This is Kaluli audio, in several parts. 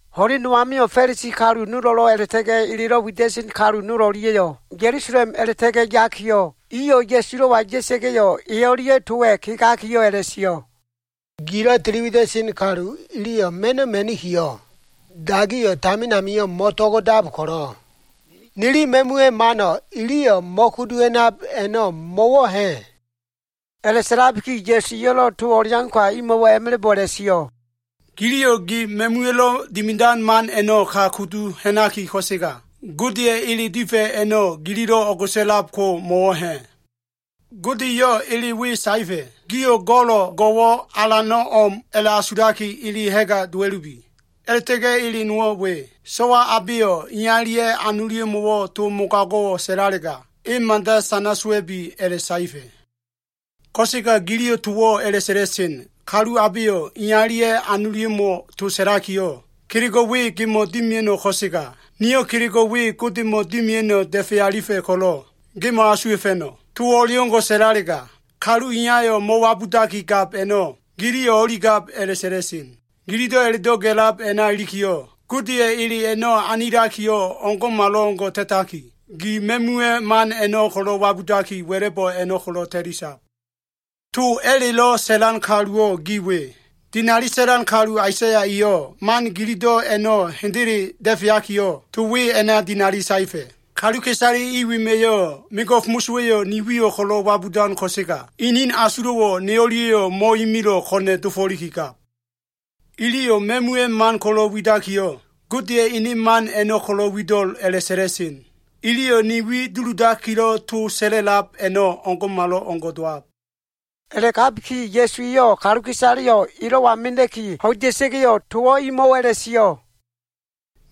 Ho꞉len no amio꞉, Fa꞉lisi kalu nolo꞉lo꞉ a꞉la꞉ta꞉ga꞉ elelo꞉ wida꞉sen kalu nol o꞉lia꞉yo꞉, Ya꞉lusalem a꞉la꞉ta꞉ga꞉ yakiyo꞉, iyo꞉ Ya꞉sulo꞉wa ya꞉sa꞉ga꞉yo꞉, e o꞉lia꞉ towa꞉ kegakiyo꞉ a꞉la꞉sio꞉. “Gilo꞉ tili wida꞉sen kalu iliyo꞉ ma꞉no꞉ ma꞉nikiyo꞉, dagiyo꞉ tamin amio꞉ mo꞉to꞉go꞉dab ko꞉lo꞉, nili ma꞉muwa꞉ mano꞉ ili mo꞉kudu ha꞉nab a꞉no꞉ mo꞉wo꞉ ha꞉?” A꞉la꞉sa꞉labiki Ya꞉su eyo꞉lo꞉ to o꞉leauka imo꞉wo꞉ a꞉ma꞉la꞉bo꞉ a꞉la꞉sio꞉, “Giliyo꞉ gi ma꞉muwa꞉lo꞉ dimidan man a꞉no꞉ ka kudu ha꞉naki, ko꞉sega Godeya꞉ ele difa꞉ a꞉no꞉ gililo꞉ o꞉go꞉sa꞉lab ko mo꞉wo꞉ ha꞉? Gode eyo꞉ ele we saefa꞉, ‘Gio꞉ go꞉lo꞉ go꞉wo꞉ alano꞉ o꞉m a꞉la꞉asulaki, ili ha꞉ga dowa꞉lubi.’ A꞉la꞉ta꞉ga꞉ ele nowo꞉ we, ‘So꞉wa abeyo꞉ iyalia꞉ anolia꞉mo꞉wo꞉ to mogago꞉wo꞉ sa꞉lalega, e mada sana sowa꞉bi,’ a꞉la꞉saefa꞉. Ko꞉sega giliyo꞉ towo꞉ a꞉la꞉sa꞉la꞉sen, ‘Kalu abeyo꞉ iyalia꞉ anolia꞉mo꞉ sa꞉lakiyo꞉, “Kelego꞉ we gemo꞉ dimia꞉no꞉ ko꞉sega, niyo꞉ kelego꞉ we Godemo꞉ dimia꞉no꞉ da꞉fe alifa꞉ ko꞉lo꞉ ge mo꞉asuwa꞉fa꞉no꞉,” towo꞉ o꞉leo꞉ngo꞉ sa꞉lalega, kalu iyayo꞉ mo꞉wabudaki gab a꞉no꞉ giliyo꞉ o꞉ligab a꞉la꞉sa꞉la꞉sen. Gilido꞉ a꞉la꞉do꞉ ga꞉lab a꞉na ilikiyo꞉, Godeya꞉ ele a꞉no꞉ anilakiyo꞉ o꞉ngo꞉malo꞉ngo꞉ ta꞉taki, gi ma꞉muwa꞉ man a꞉no꞉ wabudaki wa꞉la꞉bo꞉ a꞉no꞉ ko꞉lo꞉ ta꞉lisab. To mosowa꞉lo꞉ widan kaluwo꞉ gi we. Dinali sa꞉lan kalu Aisaya eyo꞉ man gilido꞉ a꞉no꞉ hendele da꞉feakiyo꞉, to we a꞉na dinali saefa꞉, “ ‘Kaluka꞉isale i wema꞉ mego꞉f mosowa꞉yo꞉ ni wiyo꞉ ko꞉lo꞉ wabudan, ko꞉sega inin asulo꞉wo꞉ ne o꞉lia꞉yo꞉ mo꞉imilo꞉, ko꞉na꞉ dofo꞉likigab. Iliyo꞉ ma꞉muwa꞉ man ko꞉lo꞉ widakiyo꞉, Godeya꞉ ene man a꞉no꞉ ko꞉lo꞉ wido꞉l a꞉la꞉sa꞉la꞉sen. Iliyo꞉ ne wi duludakilo꞉ to sa꞉la꞉lab a꞉no꞉ o꞉ngo꞉malo꞉ngo꞉ dowab.’” A꞉la꞉gabiki, Ya꞉suwa꞉yo꞉ kaluka꞉isaleyo꞉ elo꞉wa mena꞉ki ho꞉ida꞉sa꞉ga꞉yo꞉, towo꞉ imo꞉wo꞉ a꞉la꞉sio꞉.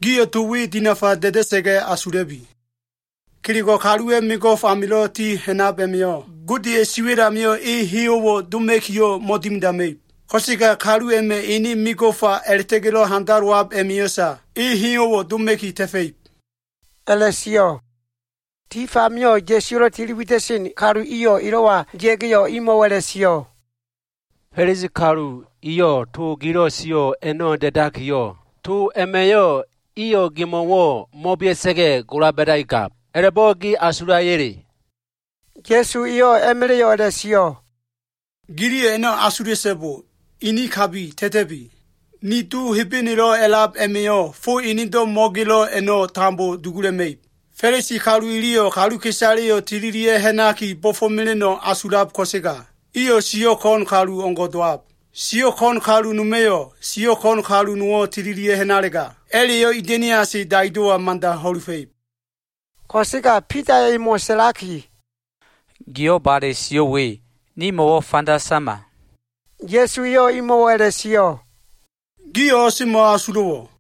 “Gio꞉ to we dinafa da꞉da꞉sa꞉ga꞉ asula꞉bi. Kelego꞉ kaluwa꞉ mego꞉f amilo꞉ ti ha꞉nab a꞉ma꞉yo꞉, Godeya꞉ siwa꞉l amio꞉ e heyo꞉wo꞉ doma꞉kiyo꞉ mo꞉dimidama꞉ib. Ko꞉sega kalu a꞉ma꞉ ene mego꞉fa a꞉la꞉ta꞉ga꞉lo꞉ handalowab a꞉ma꞉yo꞉sa, e heyo꞉wo꞉ doma꞉ki ta꞉fa꞉ib,” a꞉la꞉sio꞉. Tif amio꞉ Ya꞉suwa꞉lo꞉ tili wida꞉sen kalu iyo꞉ elo꞉wa ya꞉ga꞉yo꞉ emo꞉wo꞉ a꞉la꞉sio꞉, “Fa꞉lisi kalu iyo꞉ to gilo꞉ sio꞉ a꞉no꞉ da꞉da꞉likiyo꞉, iyo꞉ to a꞉ma꞉yo꞉ gemo꞉wo꞉ mo꞉bea꞉sa꞉ga꞉, gola ba꞉daki gab, a꞉la꞉bo꞉ ge asulaya꞉le?” Ya꞉su eyo꞉ a꞉ma꞉la꞉yo꞉ a꞉la꞉sio꞉, “Giliyo꞉ a꞉no꞉ asula꞉so꞉bo. Ini kabi ta꞉ta꞉bi. Ni Do Hebenelo꞉ a꞉lab a꞉ma꞉yo꞉, fo enedo꞉ mo꞉gelo꞉ a꞉no꞉ tambo dugula꞉ma꞉ib. Fa꞉lisi kalu iliyo꞉ kaluka꞉isaleyo꞉ tililia꞉ ha꞉naki bo꞉fo꞉mela꞉no꞉ asulab ko꞉sega, iyo꞉ siyo꞉ ko꞉n kalu o꞉ngo꞉ dowab. Siyo꞉ ko꞉n kalu noma꞉yo꞉, siyo꞉ ko꞉n kalu nowo꞉ tililia꞉ ha꞉nalega, a꞉la꞉yo꞉ ida꞉niase daido꞉wa mada ho꞉lufa꞉ib.” Ko꞉sega Bidaya꞉ emo꞉ sa꞉laki, “Giyo꞉ bale sio꞉ we nimo꞉wo꞉ fanda sama.” Ya꞉su eyo꞉ imo꞉wo꞉ a꞉la꞉sio꞉, “Gio꞉ o꞉semo꞉ asulo꞉wo꞉?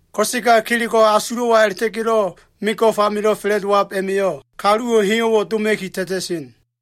Ko꞉sega kelego꞉ asulo꞉wa a꞉la꞉ta꞉ga꞉lo꞉ mego꞉f amilo꞉ fa꞉la꞉dowab a꞉ma꞉yo꞉, kaluwo꞉ heyo꞉wo꞉ doma꞉ki ta꞉ta꞉sen.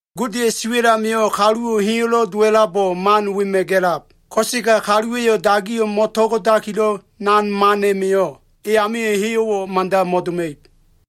Godeya꞉ siwa꞉l amio꞉ kaluwo꞉ heyo꞉lo꞉ dowa꞉labo꞉ man wema꞉ gelab. Ko꞉sega dagiyo꞉ mo꞉to꞉go꞉dakilo꞉ mano꞉ nan man a꞉ma꞉yo꞉, e amio꞉ heyo꞉wo꞉ mada mo꞉doma꞉ib.”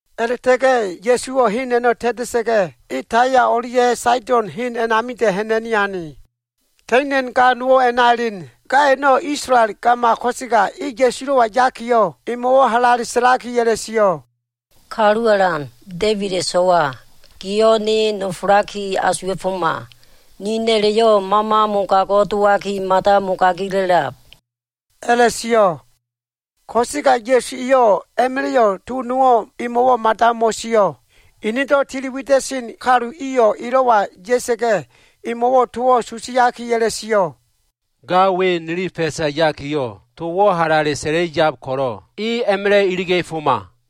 A꞉la꞉ta꞉ga꞉ Ya꞉suwo꞉ hen a꞉no꞉ ta꞉ta꞉sa꞉ga꞉, e Taya o꞉lia꞉ Saido꞉n hen a꞉namida꞉ ha꞉na꞉ni ane. Ka꞉ina꞉n ga nowo꞉ a꞉na elen. Ga a꞉no꞉, Isolael gama ko꞉sega e Ya꞉sulo꞉wa yakiyo꞉, emo꞉wo꞉ halale sa꞉laki a꞉la꞉sio꞉, “Kalu Alan, Da꞉ibida꞉ so꞉wa, giyo꞉ ne nofolaki asuwa꞉foma. Ni na꞉la꞉yo꞉ mama mogago꞉ dowaki mada mogagila꞉lab,” a꞉la꞉sio꞉. Ko꞉sega Ya꞉su eyo꞉ a꞉ma꞉la꞉yo꞉ to nowo꞉ emo꞉wo꞉ mada mo꞉sio꞉. Enedo꞉ tili wida꞉sen kalu iyo꞉ elo꞉wa ya꞉sa꞉ga꞉, emo꞉wo꞉ towo꞉ susiaki a꞉la꞉sio꞉, “Ga we nili fa꞉sa yakiyo꞉ towo꞉ halale sa꞉la꞉i yab ko꞉lo꞉, e a꞉ma꞉la꞉ iliga꞉foma.”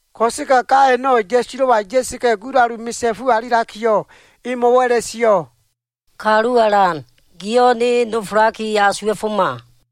Ko꞉sega ga a꞉no꞉ Ya꞉sulo꞉wa ya꞉sa꞉ga꞉ gulalu misa꞉fu alilakiyo꞉, emo꞉wo꞉ a꞉la꞉sio꞉, “Kalu Alan, giyo꞉ ne asuwa꞉foma.”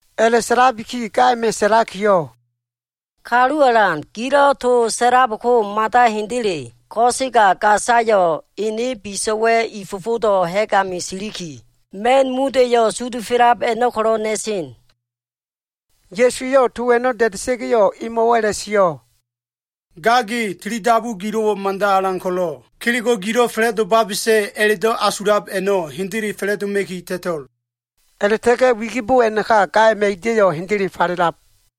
A꞉la꞉sa꞉labiki ga a꞉ma꞉ sa꞉lakiyo꞉, “Kalu Alan, gilo꞉ to sa꞉lab ko mada hendele. Ko꞉sega gasalo꞉ biso꞉wa꞉ i fofodo꞉ ha꞉g ami siliki, ma꞉n muda꞉yo꞉ sudufelab a꞉no꞉ ko꞉lo꞉ na꞉sen.” Ya꞉su eyo꞉ to a꞉no꞉ da꞉da꞉sa꞉ga꞉yo꞉, emo꞉wo꞉ a꞉la꞉sio꞉, “Ga ge, tili dabu gilo꞉wo꞉ mada alan ko꞉lo꞉, kelego꞉ gilo꞉ fa꞉la꞉domabesa꞉ a꞉la꞉do꞉ asulab a꞉no꞉, hendele fa꞉la꞉doma꞉ki ta꞉to꞉l.” A꞉la꞉ta꞉ga꞉ wigibo a꞉naka gaya꞉ ida꞉yo꞉ hendele falelab.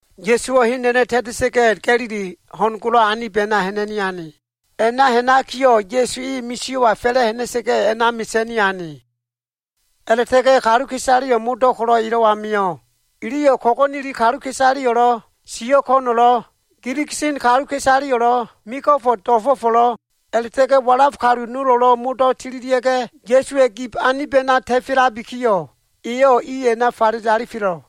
Ya꞉suwo꞉ hen a꞉no꞉ ta꞉ta꞉sa꞉ga꞉, Ga꞉lili ho꞉n golo꞉ anib a꞉na ha꞉na꞉ni ane. A꞉na ha꞉nakiyo꞉, Ya꞉su e misio꞉wa fa꞉la꞉ ha꞉na꞉sa꞉ga꞉ a꞉na mesa꞉ni ane. A꞉la꞉ta꞉ga꞉ kaluka꞉isaleyo꞉ modo꞉ ko꞉lo꞉ elo꞉wa mio꞉. Iliyo꞉ ko꞉go꞉neli kaluka꞉isaleyo꞉lo꞉, siyo꞉ ko꞉no꞉lo꞉, giligisen kaluka꞉isaleyo꞉lo꞉, mego꞉fo꞉ do꞉fo꞉fo꞉lo꞉, a꞉la꞉ta꞉ga꞉ walaf kalu nolo꞉lo꞉ modo꞉ tililia꞉ga꞉, Ya꞉suwa꞉ gib anib a꞉na ta꞉felabikiyo꞉, eyo꞉ i a꞉na falele alifelo꞉.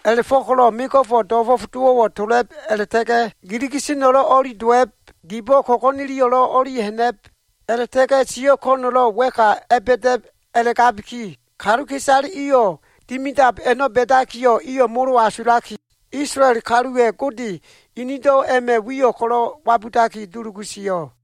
A꞉la꞉fo꞉ko꞉lo꞉ mego꞉fo꞉ do꞉fo꞉f dowo꞉wo꞉ tola꞉b, a꞉la꞉ta꞉ga꞉ giligiseno꞉lo꞉ o꞉li dowa꞉b, gibo꞉ ko꞉go꞉neliyo꞉lo꞉ o꞉li ha꞉na꞉b, a꞉la꞉ta꞉ga꞉ siyo꞉ ko꞉no꞉lo꞉ wa꞉ka a꞉ba꞉da꞉b a꞉la꞉gabiki kaluka꞉isale iyo꞉ dimidab a꞉no꞉ ba꞉dakiyo꞉, iyo꞉ mo꞉lo꞉ asulaki, Isolael kaluwa꞉ Gode inido꞉ a꞉ma꞉ wiyo꞉ ko꞉lo꞉ wabudaki dulugu sio꞉.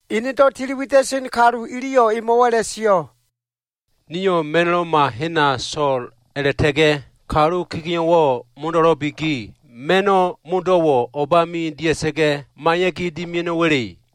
Enedo꞉ tili wida꞉sen kalu iliyo꞉ emo꞉wo꞉ a꞉la꞉sio꞉, “Nio꞉ ma꞉no꞉loma hena so꞉l a꞉la꞉ta꞉ga꞉ kalu kegeo꞉wo꞉ modo꞉lo꞉biki, ma꞉no꞉ modo꞉wo꞉ o꞉bami dia꞉sa꞉ga꞉ maiya꞉ki dimia꞉no꞉wa꞉le?”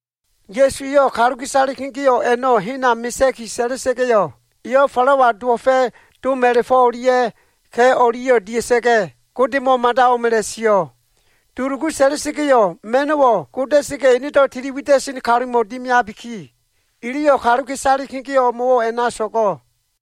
Ya꞉su eyo꞉ kaluka꞉isale kegeo꞉ a꞉no꞉ hena mesea꞉ki sa꞉la꞉sa꞉ga꞉yo꞉, eyo꞉ falawa dowo꞉fa꞉ dom a꞉la꞉fo꞉ o꞉lia꞉ ka꞉ o꞉lia꞉yo꞉ dia꞉sa꞉ga꞉, Godemo꞉ mada o꞉m a꞉la꞉sio꞉. Dulugu sa꞉la꞉sa꞉ga꞉yo꞉, ma꞉no꞉wo꞉ goda꞉sa꞉ga꞉, enedo꞉ tili wida꞉sen kalumo꞉ dimiabiki, iliyo꞉ kaluka꞉isale kegeo꞉ o꞉mo꞉wo꞉ a꞉na so꞉go꞉.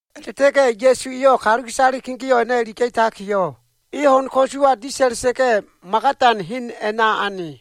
A꞉la꞉ta꞉ga꞉ Ya꞉su eyo꞉ kaluka꞉isale kegeo꞉ a꞉no꞉ iliga꞉takiyo꞉, e ho꞉n ko꞉suwa disa꞉la꞉sa꞉ga꞉, Magadan hen a꞉na ane.